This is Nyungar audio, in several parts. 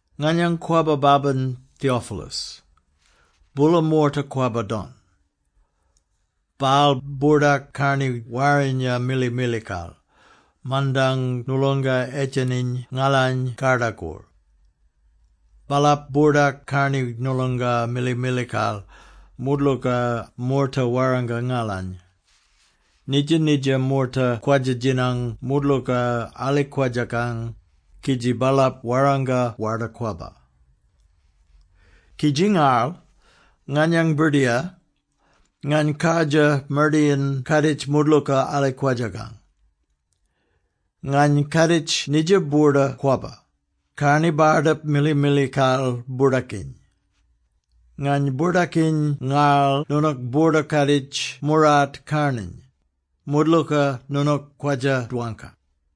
Nganyang kwabba babin, Theophilus. Boola moorta kwabba-don. Baal boordak karni warrinya mili-milikal, mandang noolonga edjeniny ngalany kardakor. Baalap boordak karni noolonga mili-milikal, moodlooka moorta warranga ngalany. Nidja-nidja moorta kwadja-djinang moodlooka alikwadjakang, kidji baalap warranga Warda-Kwabba. Kidji ngarl, nganyang birdiyar, ngany kardjir mardayin-kaaditj moodlooka alikwadjakang. Ngany kaaditj nidja boorda kwabba, karni bardip mili-milikal boordakiny. Ngany boordakiny ngarl noonook boorda-kaaditj moorart karnarny, moodlooka noonook kwadja-dwangka.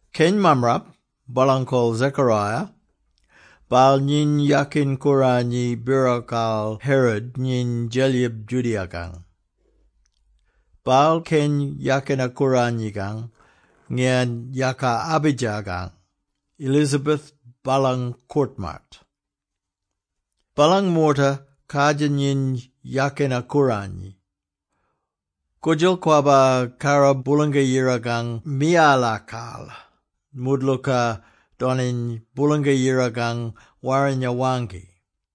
Keny mammarap, baalang kol Zechariah, baal nyiny yakin-kooranyi birokal Herod nyiny Djelyib Judea-kang. Baal keny yakina-kooranyikang ngiyan yaka Abijah-kang. Elizabeth baalang koort-maat. Baalang moorta kardjir nyiny yakina-kooranyi. Koodjal kwabba karra Boolanga-Yirakang miyalakal, moodlooka doniny Boolanga-Yirakang Warrinya waangki.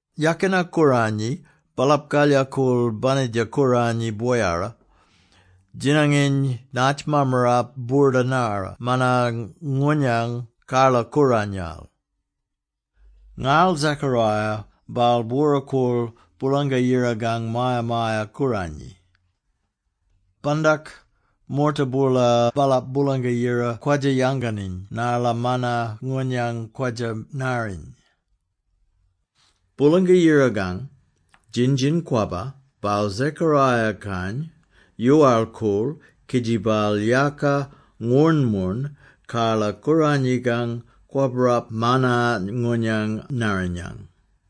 Yakina-kooranyi, baalap kalyakool banitja kooranyi boyara, djinanginy naatj mammarap boorda-narra manna-ngoonyang karla-kooranyal. Ngarl Zachariah, baal bwora-koorl Boolanga-Yirakang Maya-maya-Kooranyi. Bandak, moorta boola baalap Boolanga-Yira kwadja-yanganiny narla manna-ngoonyang kwadja-narriny. Boolanga-Yirakang djin-djin-kwabba, baal Zechariah-kany yoowal-koorl, kidji baal yaaka ngwoornmoorn karla-kooranyikang, kwabbarap manna-ngoonyang narrinyang.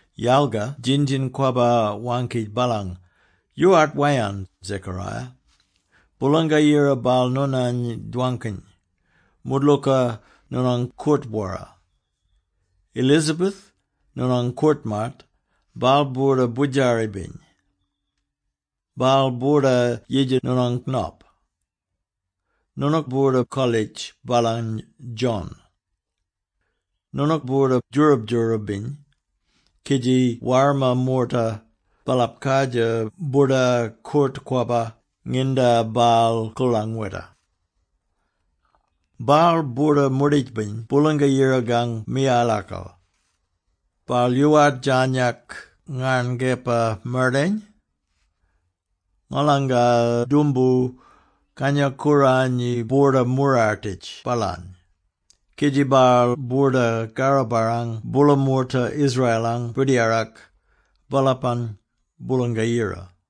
Yalga djin-djin-kwabba waangki baalany, “Yoowart wayarn, Zechariah! Boolanga-Yira baal noonany dwangkiny, moodlooka noonang koort-bwora. Elizabeth, noonang koort-maat, baal boorda boodjari-biny. Baal boorda yidja noonang nop. Noonook boorda-kolitj baalany ‘John’. Noonook boorda djoorab-djoorab-biny, kidji warma moorta, baalap kardjir boorda koort-kwabba nginda baal koorlangweta! “Baal boorda moorditj-biny Boolanga-Yirakang miyalakal. Baal yoowart djarnyak ngarn kepa-mardayin. Ngolanga doomboo, Kangya-Kooranyi boorda-moorartitj baalany, kidji baal boorda karro-barrang boola moorta Israel-ang Birdiyarak, baalapang Boolanga-Yira.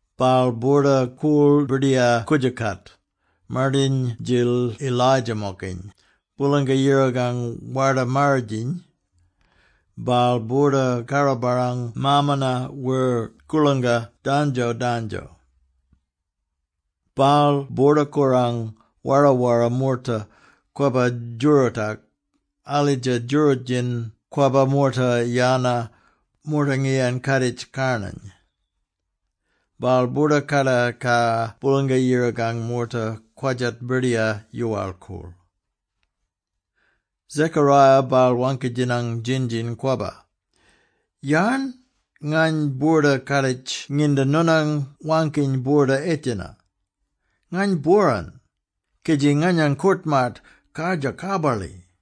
“Baal boorda-koorl Birdiyar-koodjookat, mardayin-djil Elijah-mokiny, Boolanga-Yirakang Warda-Marridjiny. Baal boorda karro-barrang maamana wer koorlangka dandjo-dandjo. Baal boorda korang wara-wara moorta kwabba djoorootak, alidja djooroot-djin kwabba moorta yana, moorta ngiyan kaaditj karnarny. Baal boorda kakatar Boolanga-Yirakang moorta kwadjat Birdiyar yoowal-koorl.” Zechariah baal waangki-djinang djin-djin-kwabba, “Yarn ngany boorda-kaaditj nginda noonang waangkiny boorda edjena? Ngany bworan, kidji nganyang koort-maat kardjir karbarli.”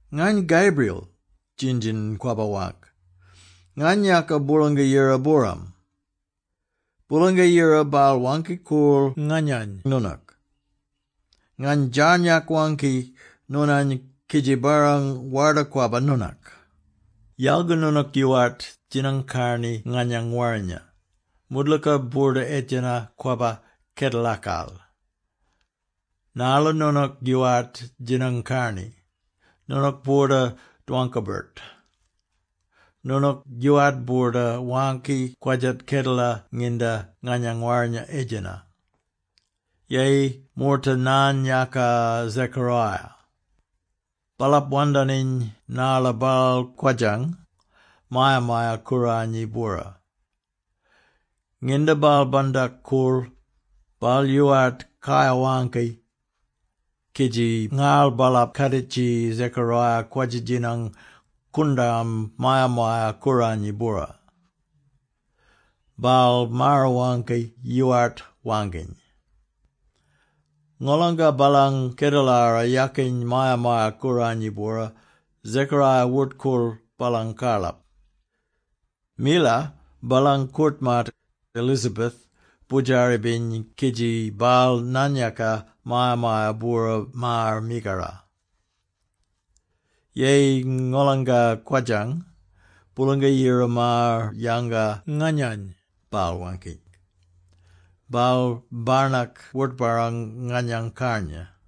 “Ngany Gabriel,” djin-djin-kwabba waangk. “Ngany yaaka Boolanga-Yira-booram. Boolanga-Yira baal waangki-koorl nganyany noonak. Ngany djarnyak waangki noonany kidji barrang Warda-Kwabba noonak! “Yalga noonook yoowart djinang-karni nganyang warrinya. Moodlooka boorda-edjena kwabba kedelakal. Narla noonook yoowart djinang-karni, noonook boorda dwangka-birt. Noonook yoowart boorda waangki kwadjat kedela nginda nganyang warrinya edjena.” Yeyi moorta naan-yaaka Zechariah. Baalap wandaniny narla baal kwodjang Maya-maya-Kooranyi-bwora. Nginda baal bandak-koorl, baal yoowart kayar-waangki, kidji ngarl baalap kaaditji Zechariah kwadja-djinang koondarm Maya-maya-Kooranyi bwora. Baal maar-waangki, yoowart waangkiny. Ngolanga baalang kedelara yakiny Maya-maya-Kooranyi bwora, Zechariah wort-koorl baalang karlap. Mila, baalang koort-maat, Elizabeth, boodjari-biny kidji baal naan-yaaka maya-maya-bwora maar mikara. “Yeyi ngolanga kwodjang, Boolanga-Yira maar-yanga nganyany,” baal waangki. “Baal barnak wort-barrang nganyang karnya!”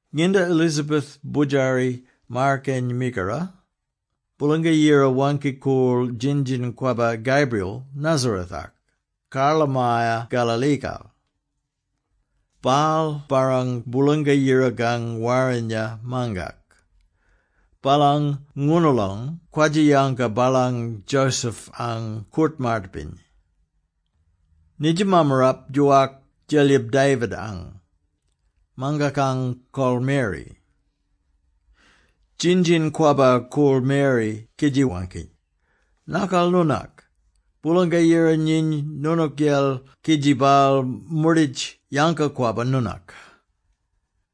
Nginda Elizabeth boodjari maar-keny mikara, Boolanga-Yira waangki-koorl djin-djin-kwabba Gabriel Nazareth-ak, karlamaya Galilee-kal. Baal barrang Boolanga-Yirakang warrinya mangak. Baalang ngoonoolong kwadja-yanga baalany Joseph-ang koort-maat-biny. Nidja mammarap djoowak Djelyib David-ang. Mangakang kol ‘Mary’. Djin-djin-kwabba koorl Mary kidji waangki, “Nakal noonak! Boolanga-Yira nyiny noonookyel kidji baal moorditj yanga-kwabba noonak!”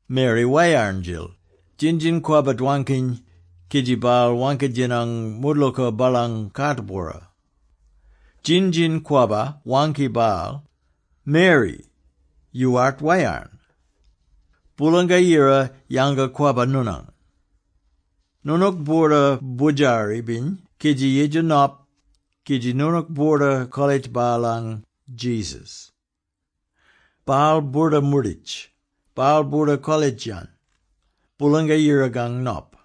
Mary wayarn-djil, djin-djin-kwabba dwankiny, kidji baal waangki-djinang moodlooka baalang kaat-bwora. Djin-djin-kwabba waangki baal, “Mary! Yoowart wayarn! Boolanga-Yira yanga-kwabba noonany. Noonook boorda boodjari-biny kidji yidja nop, kidji noonook boorda-kolitj baalany ‘Jesus.’ Baal boorda moorditj. Baal boorda kolitj-yan ‘Boolanga-Yirakang Nop’.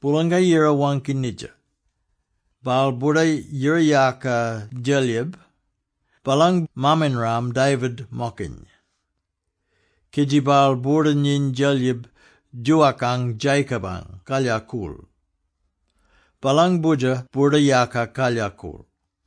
Boolanga-Yira waangki nidja. Baal boorda yira-yaaka Djelyib, baalang maam-inram David-mokiny. Kidji baal boorda nyiny Djelyib djoowakang Jacob-ang kalyakool. Baalang Boodjer boorda-yaaka kalyakool!”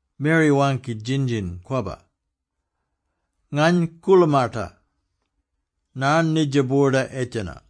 Mary waangki djin-djin-kwabba, “Ngany koolamata. Yarn nidja boorda edjena?”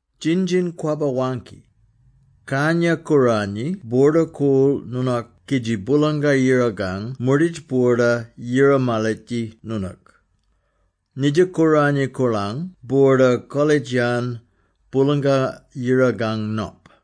Djin-djin-kwabba waangki, “Kangya-Kooranyi boorda-koorl noonak kidji Boolanga-Yirakang moorditj boorda yira-malitji noonook. Nidja kooranyi koorlang boorda kolitj-yan ‘Boolanga-Yirakang Nop’.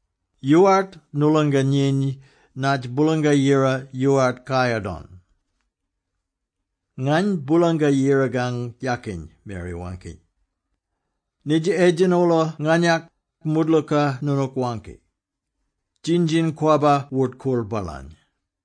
Yoowart noolonga nyiny naatj Boolanga-Yira yoowart kayar don.” “Ngany Boolanga-Yirakang yakin,” Mary waangki. “Nidja edjena-oola nganyak, moodlooka noonook waangki.” Djin-djin-kwabba wort-koorl baalany.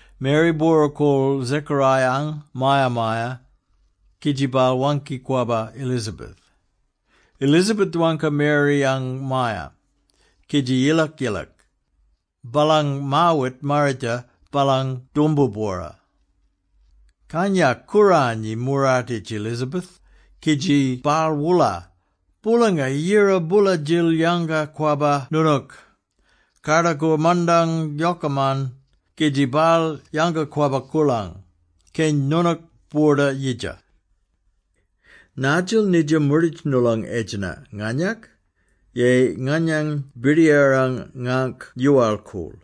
Mary bwora-koorl Zechariah-ang maya-maya, kidji baal waangki-kwabba Elizabeth. Elizabeth dwangka Mary-ang maaya, kidji yilak-yilak, baalang maawit marridja baalang doomboo-bwora. Kangya-Kooranyi moorartitj Elizabeth, kidji baal woola, “Boolanga-Yira boola-djil yanga-kwabba noonook, kardakor mandang yokaman, kidji baal yanga-kwabba koorlang, keny noonook boorda yidja! “Naadjil nidja moorditj noolong edjena nganyak, yeyi nganyang Birdiyarang ngaangk yoowal-koorl,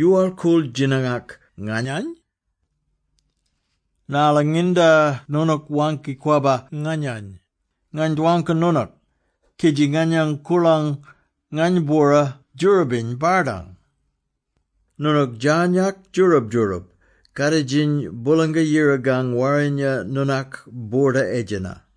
yoowal-koorl djinangak nganyany? Narla nginda noonook waangki-kwabba nganyany, ngany dwangka noonook, kidji nganyang koorlang ngany-bwora djoorabiny bardang. Noonook djarnyak djoorab-djoorab, kaaditjiny Boolanga-Yirakang warrinya noonak boorda-edjena!”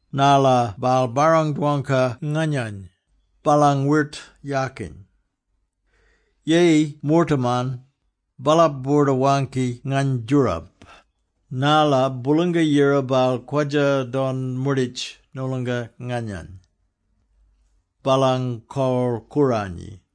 narla baal barrang-dwangka nganyany, baalang wirt yakin! Yeyi moortaman, baalap boorda-waangki ngany djoorab, narla Boolanga-Yira baal kwadja-don moorditj noolonga nganyang. Baalang kol kooranyi.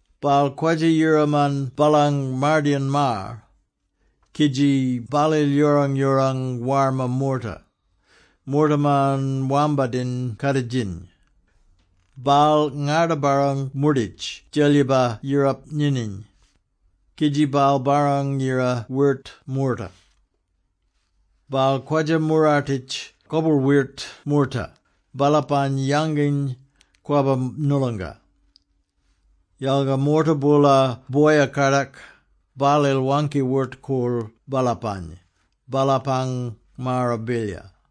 Baal kwadja-yiraman baalang mardayin maar, kidji baalil yoorang-yoorang warma moorta, moortaman wambadin kaaditjiny. Baal ngarda-barrang moorditj djelyiba yirap nyinyiny, kidji baal barrang-yira wirt moorta. Baal kwadja-moorartitj koboorl-wirt moorta, baalapany yanginy kwabba noolonga, yalga moorta boola boya-kadak, baalil waangki-wort-koorl baalapany, baalapang maara bilyar.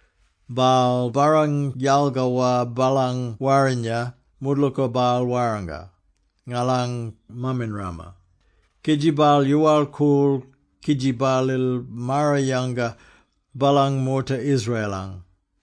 Baal barrang-yalgawa baalang warrinya, moodlooka baal warranga ngalang maam-inrama, kidji baal yoowal-koorl kidji baalil maar-yanga baalang moorta Israel-ang.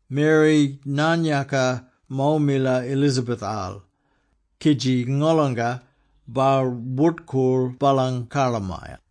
Mary naan-yaaka mo mila Elizabeth-al, kidji ngolonga, baal wort-koorl baalang karlamaya.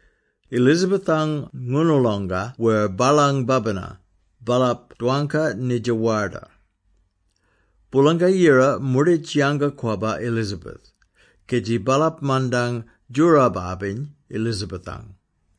Elizabeth-ang ngoonoolonga wer baalang babina, baalap dwangka nidja warda. Boolanga-Yira moorditj yanga-kwabba Elizabeth, kidji baalap mandang djoorab-abiny Elizabeth-ang.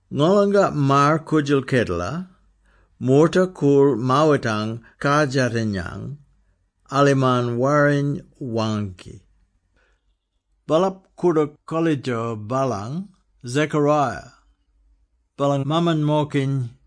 Ngolanga maar-koodjal kedela, moorta koorl maawitang kardjatinyang, alimarn Warriny waangki. Baalap koordook kolitjo baalany ‘Zechariah’, baalang maaman-mokiny.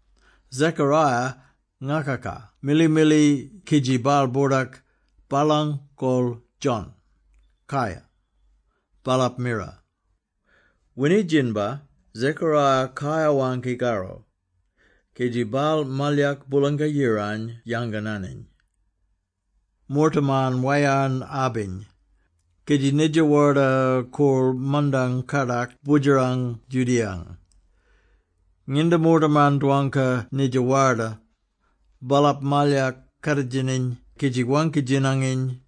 Zechariah ngakaka mili-mili kidji baal boordak, “Baalang kol ‘John’.” “Kai!” baalap mira. Winidjinbar, Zechariah kayar waangki karro, kidji baal malyak Boolanga-Yirany yangananiny. Moortaman wayarn-abiny, kidji nidja warda koorl mandang kardak boodjerang Judea-ang. Nginda moortaman dwangka nidja warda, baalap malyak kaaditjiiny kidji waangki-djinanginy,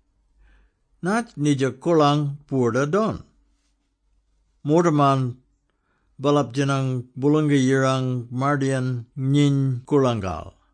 “Naatj nidja koorlang boorda-don?” Moortaman, baalap djinang Boolanga-Yirang mardayin nyiny koorlangal.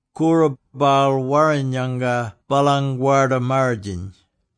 Koora, baal warrin-yanga baalang Warda Marridjiny.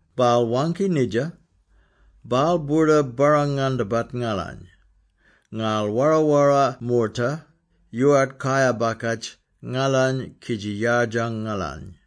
Baal waangki nidja, baal boorda barrang-ngandabat ngalany, ngarl wara-wara moorta yoowart kayar-bakatj ngalany kidji yardjang ngalany.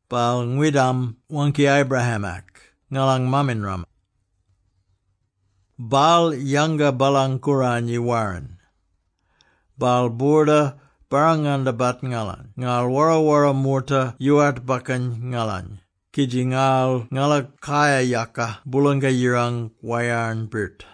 Baal ngwidam waangki Abraham-ak, ngalang maam-inram. Baal yanga baalang kooranyi warrin. Baal boorda barrang-ngandabat ngalany ngarl wara-wara moorta yoowart bakkan ngalany, kidji ngarl ngala kayar-yaka Boolanga-Yirang, wayarn-birt.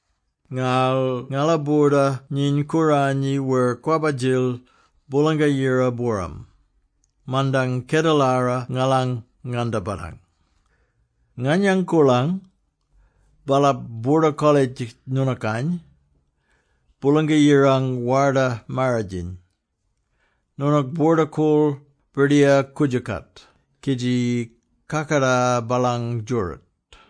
Ngarl ngala boorda nyiny kooranyi wer kwabba-djil, Boolanga-Yira-booram, mandang kedelara ngalang ngandabatang. Nganyang koorlang, baalap boorda-kolitj noonookany, ‘Boolanga-Yirang Warda Marridjiny’. Noonook boorda-koorl Birdiyar koodjookat kidji kakatar baalang djooroot,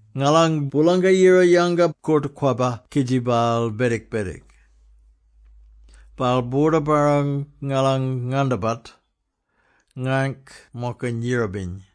Ngalang Boolanga-Yira yanga koort-kwabba kidji baal bedik-bedik. Baal boorda barrang ngalang ngandabat, ngangk-mokiny yirabiny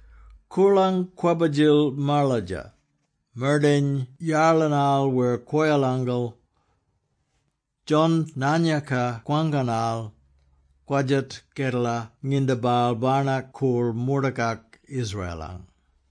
Koorlang kwabba-djil maladja, mardayan yarlinal wer kwoyalangal. John naan-yaaka kwangkanal kwadjat kedela nginda baal barnak koorl moortakak Israel-ang.